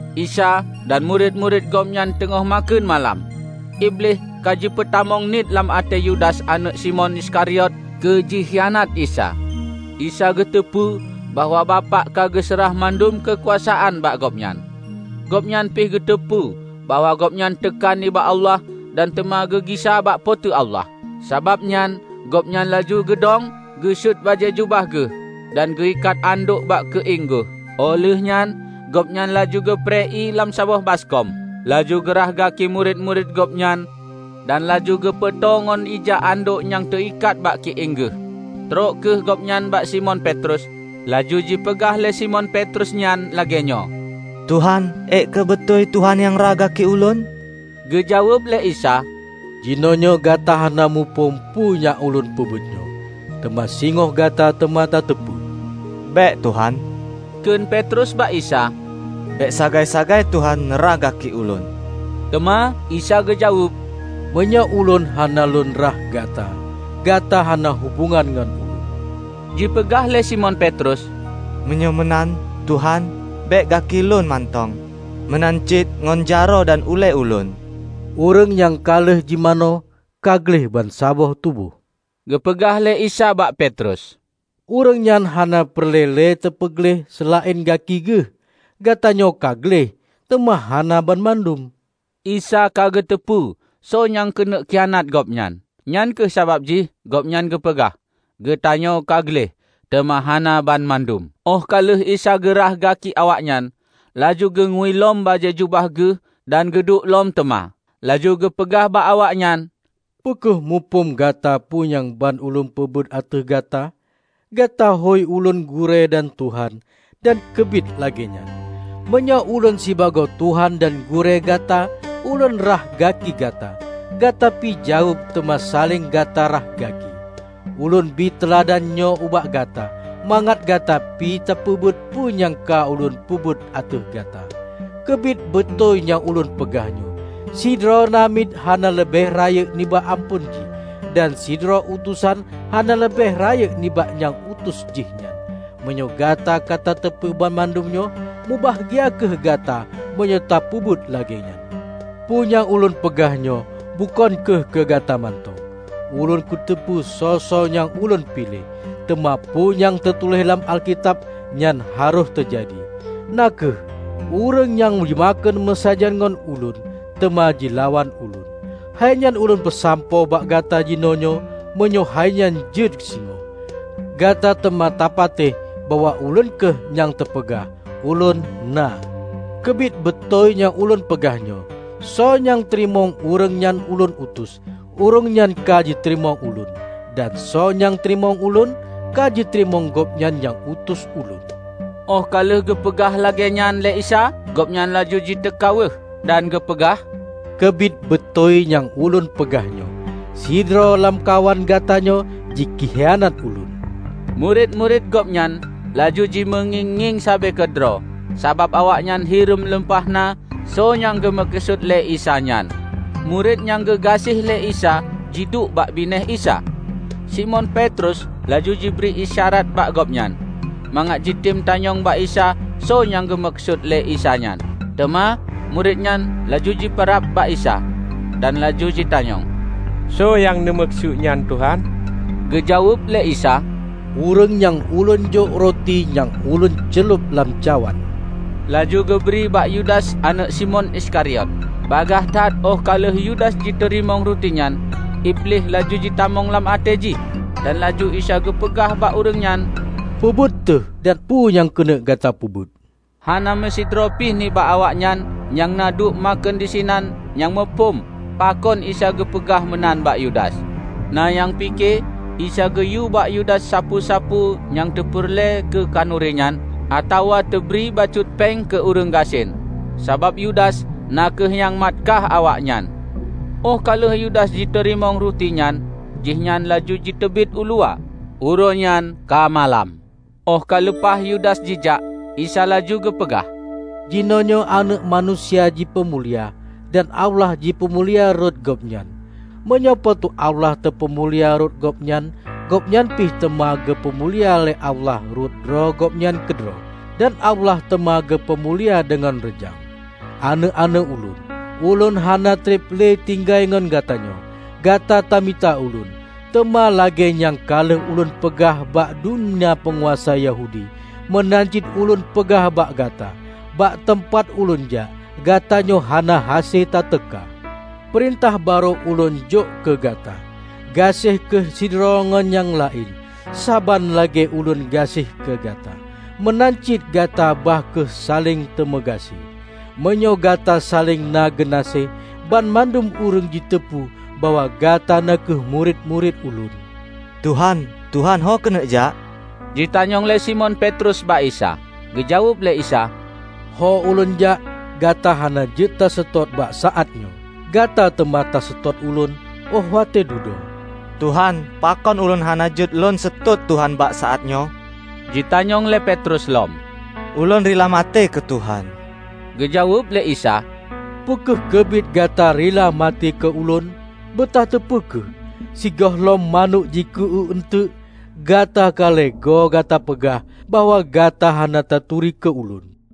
Isa dan murit-murit Gobnyan teungoh makheun malam. Iblih ka jipeutamong niet lam até Yudas aneuëk Simon Iskariot keu jikhianat Isa. Isa geuteupeue bahwa Bapak ka geuseurah mandum keukuasaan bak Gobnyan. Gobnyan pih geuteupeue bahwa Gobnyan teuka nibak Allah dan teuma geugisa bak Po teu Allah. Sabab nyan Gobnyan laju geudong, geusuet bajée jubah Geuh, dan geuikat andok bak keuieng Geuh. Óh lheuehnyan Gobnyan laju geuprée ié lam saboh baskom, laju geurhah gaki murit-murit Gobnyan dan laju geupeutô ngon ija andok nyang teuikat bak keuieng Geuh. Trok kheueh gobnyan bak Simon Petrus, laju jipeugah lé Simon Petrus nyan lagée nyoe, "Tuhan, ék kheueh beutôi Tuhan nyang rhah gaki ulôn?" Geujaweueb lé Isa, "Jinoenyoe gata hana muphom peue nyang Ulôn peubuet nyoe, teuma singoh gata teuma tateupeue." "Bék, Tuhan," kheun Petrus bak Isa, "Bék sagai-sagai Tuhan neu rhah gaki Ulôn!" Teuma Isa geujaweueb, "Meunyoe Ulôn hana Lôn rhah gata, gata hana hubongan ngon Ulôn." Jipeugah lé Simon Petrus, "Meunyoe meunan, Tuhan, bék gaki lôn mantong, meunan cit ngon jaroe dan ulée ulôn!" "Ureuëng nyang ka lheueh jimanoe, ka gleh bansaboh tuboh," geupeugah lé Isa bak Petrus. "Ureuëng nyan hana peureulée le teupeugleh seulaén gaki geuh. Gatanyoe ka gleh, teuma hana banmandum." ( Isa ka geuteupeue soe nyang keuneuk khianat Gobnyan. Nyang kheueh sabab jih Gobnyan geupeugah, "Gatanyoe ka gleh, teuma hana banmandum.") Óh ka lheueh Isa geu rhah gaki awaknyan, laju geungui lom bajée jubah Geuh dan geuduek lom teuma. Laju geupeugah bak awaknyan, "Peu kheueh muphom gata peue nyang ban Ulôn peubuet ateueh gata? Gata hôi Ulôn Gurée dan Tuhan. Dan keubiet lagée nyan. Meunyoe Ulôn sibagoe Tuhan dan Gurée gata Ulôn rhah gaki gata, gata pi wajéb teuma saléng gata rhah gaki. Ulôn bie teuladan nyoe ubak gata, mangat gata pi tapeubuet peue nyang ka Ulôn peubuet ateueh gata. Keubiet beutôi nyang Ulôn peugah nyoe: Sidroe namiet hana leubeh rayeuk nibak amphon jih, dan sidroe utosan hana leubeh rayeuk nibak nyang utus jih nyan. Meunyoe gata ka tateupeue banmandum nyoe, mubahgia kheueh gata meunyoe tapeubuet lagée nyan. Peue nyang ulôn peugah nyoe bukon kheueh keu gata mantong. Ulôn kuteupeue soe-soe nyang ka Ulôn piléh. Teuma peue nyang teutuléh lam Alkitab, nyan harôh teujadi, na kheueh, 'Ureuëng nyang jimakheun meusajan ngon Ulôn, teuma jilawan Ulôn.' Hainyan Ulôn peusampoe bak gata jinoenyoe, meunyoe hainyan jeuet singoh, gata teuma tapatéh bahwa Ulôn kheueh nyang teupeugah ULÔN NA. Keubiet beutôi nyang Ulôn peugah nyoe: Soe nyang teurimong ureuëng nyang Ulôn utus, ureuëng nyan ka jiteurimong Ulôn. Dan soe nyang teurimong Ulôn, ka jiteurimong Gobnyan nyang utus Ulôn." Óh ka lheueh geupeugah lagée nyan lé Isa, Gobnyan laju jiteuka weueh. Dan geupeugah, "Keubiet beutôi nyang Ulôn peugah nyoe: sidroe lamkawan gatanyoe jikhianat Ulôn." Murit-murit Gobnyan laju jimeungieng-ngieng sabe keudroe sabab awaknyan hireuen lumpah na soe nyang geumeukeusut lé Isa nyan. Murit nyang geugaséh lé Isa jiduek bakbinéh Isa. Simon Petrus laju jibri isyarat bak Gobnyan, mangat jitem tanyong bak Isa soe nyang geumeukeusut lé Isa nyan. Teuma murit nyan laju jipeurab bak Isa, dan laju jitanyong, "Soe nyang neumeukeusut nyan, Tuhan?" Geujaweueb lé Isa, "Ureuëng nyang Ulôn jok ruti nyang Ulôn ceulob lam cawan; laju geubri bak Yudas aneuëk Simon Iskariot. Bagaih that óh ka lheueh Yudas jiteurimong ruti nyan, Iblih laju jitamong lam até jih, dan laju Isa geupeugah bak ureuëng nyan, "Peu buet teuh dan peue nyang keuneuk gata peubuet." Hana meusidroe pi nibak awaknyan nyang na duek makheun disinan nyang muphom pakon Isa geupeugah meunan bak Yudas. Na nyang pike Isa geuyue bak Yudas sapeue-sapeue nyang teupeureulée keu khanuri nyan, atawa teubri bacut péng keu ureuëng gasien -- sabab Yudas na kheueh nyang mat kaih awaknyan. Óh ka lheueh Yudas jiteurimong ruti nyan, jihnyan laju jiteubiet u luwa. Uroe nyan ka malam. Óh ka leupah Yudas jijak, Isa laju geupeugah, "Jinoenyoe Aneuëk Manusia jipeumulia, dan Allah jipeumulia rot Gobnyan. Meunyoe Po teu Allah teupeumulia rot Gobnyan, Gobnyan pi teuma geupeu mulia lé Allah rot droe Gobnyan keudroe. Dan Allah teuma geupeu mulia deungoe reujang. Aneuëk-aneuëk Ulôn, Ulôn hana treb le tinggai ngon gatanyoe. Gata tamita Ulôn, teuma lagée nyang ka lheueh Ulôn peugah bak dumna peunguasa Yahudi, meunan cit Ulôn peugah bak gata; bak teumpat Ulôn jak, gatanyoe hana hase tateuka. Peurintah barô Ulôn jok keu gata: Gaséh kheueh sidroe ngon nyang laén. Saban lagée Ulôn gaséh keu gata, meunan cit gata bah kheueh saléng tameugaséh. Meunyoe gata saléng na geunaséh, banmandum ureuëng jiteupeue bahwa gata na kheueh murit-murit Ulôn." "Tuhan, Tuhan ho keuneuk jak?" jitanyong lé Simon Petrus bak Isa, geujaweueb lé Isa, "Ho Ulôn jak, gata hana jeuet taseutôt bak saát nyoe. Gata teuma taseutôt Ulôn óh watée dudoe." "Tuhan, pakon ulôn hana jeuet lôn seutôt Tuhan bak saát nyoe?" jitanyong lé Petrus lom. "Ulôn rila maté keu Tuhan!" Geujaweueb lé Isa, "Peu kheueh keubiet gata rila maté keu Ulôn? Beutateupeue kheueh, sigohlom manök jiku-uék eunteuk, gata ka lhée goe, gata peugah bahwa gata hana taturi keu Ulôn!"